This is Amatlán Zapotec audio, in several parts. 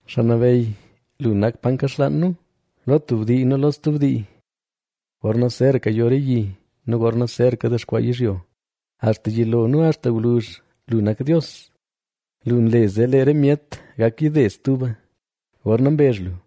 Xaa Nabeyy, lu nak pa nkaxlaan nu, lo tub dii nu lo stub dii. Gorna zeraka yo re yi nu gorna zeraka dexkwaa yizhyo, axta yilo nu axta gwluzh, lu nak Dios. Lu nle zee lee re myet gak yide stuba, gorna mbezh lu: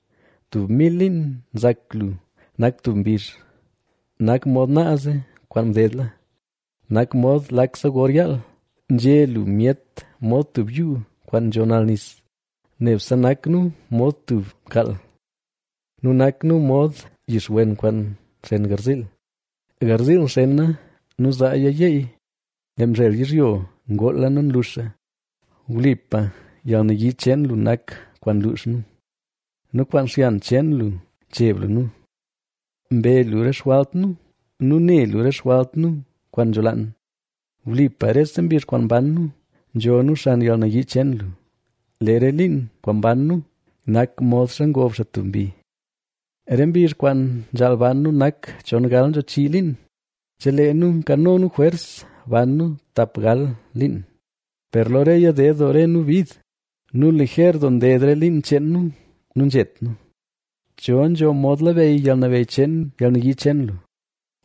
Tub mil liin nzak lu nak tub mbizh, nak mod naaze kwaan mdedla, nak mod lakse gor yaal. Nzhe lu myet mod tub yuu kwaan nzho nal nis; nebse nak nu mod tub mkaal. Nu nak nu mod yixwen kwaan nxen garziil; garziil nxena nu zaaya yeey, lee mzhel yizhyo ngoola nu nluxa. Wlipa yalnayii cheen lu nak kwaan nluux nu nu kwaan xyan cheen lu ncheb lu nu. Mbe lu re xjwalt nu nu ne lu re xjwalt nu kwaan nzholaan. Wlipa rese mbizh kwaan mban nu nzho nu xan yalnayii cheen lu; lee re liin kwaan mban nu nak modxa ngob xaa tub mbi. Re mbizh kwaan nzhaal ban nu nak chongal nzho chii liin; chelee nu nkano nu jwers ban nu tap gal liin, Per lo reya ded doo re nu bid nu liger doo nded re liin cheen nu nu nzhet nu. ¿Cho nzho mod labeyy yalnabeyy cheen yalnayii cheen lu?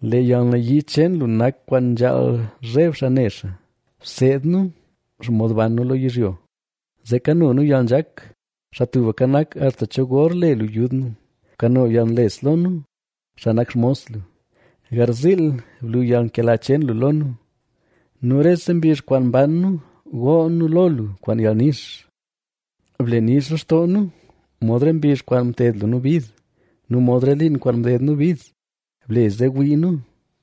lee yalnayii cheen lu nak kwaan nzhaal zheb xaa ne xaa, Bseed nu xomod ban nu lo yizhyo, zee kano nu yalnzhak. ¿Xaa Tubka Nak, axta cho gor le lu yud nu? ¡Bkano yalnles lo nu, xaa nak xmos lu! Garziil blu yalnkela cheen lu lo nu, nu rese mbizh kwaan mban nu gool nu lo lu kwaan yalnix. Ble nix lextoo nu, mod re mbizh kwaan mted lu nu bid, nu mod re liin kwaan mded nu bid. Ble zee wii nu,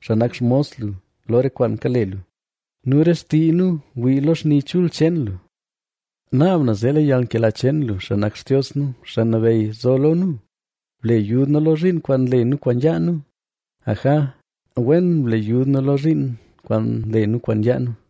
xaa nak xmos lu, lo re kwaan kale lu nu re xtii nu wii lo xni chul cheen lu. Naab na zee lee yalnkela cheen lu, xaa nak Xtios nu, Xaa Nabeyy, zo lo nu, Ble yud nu lo zhiin kwaan nle nu kwaan yaa nu; aja, wen ble yud nu lo zhiin kwaan nle nu kwaan yaa nu.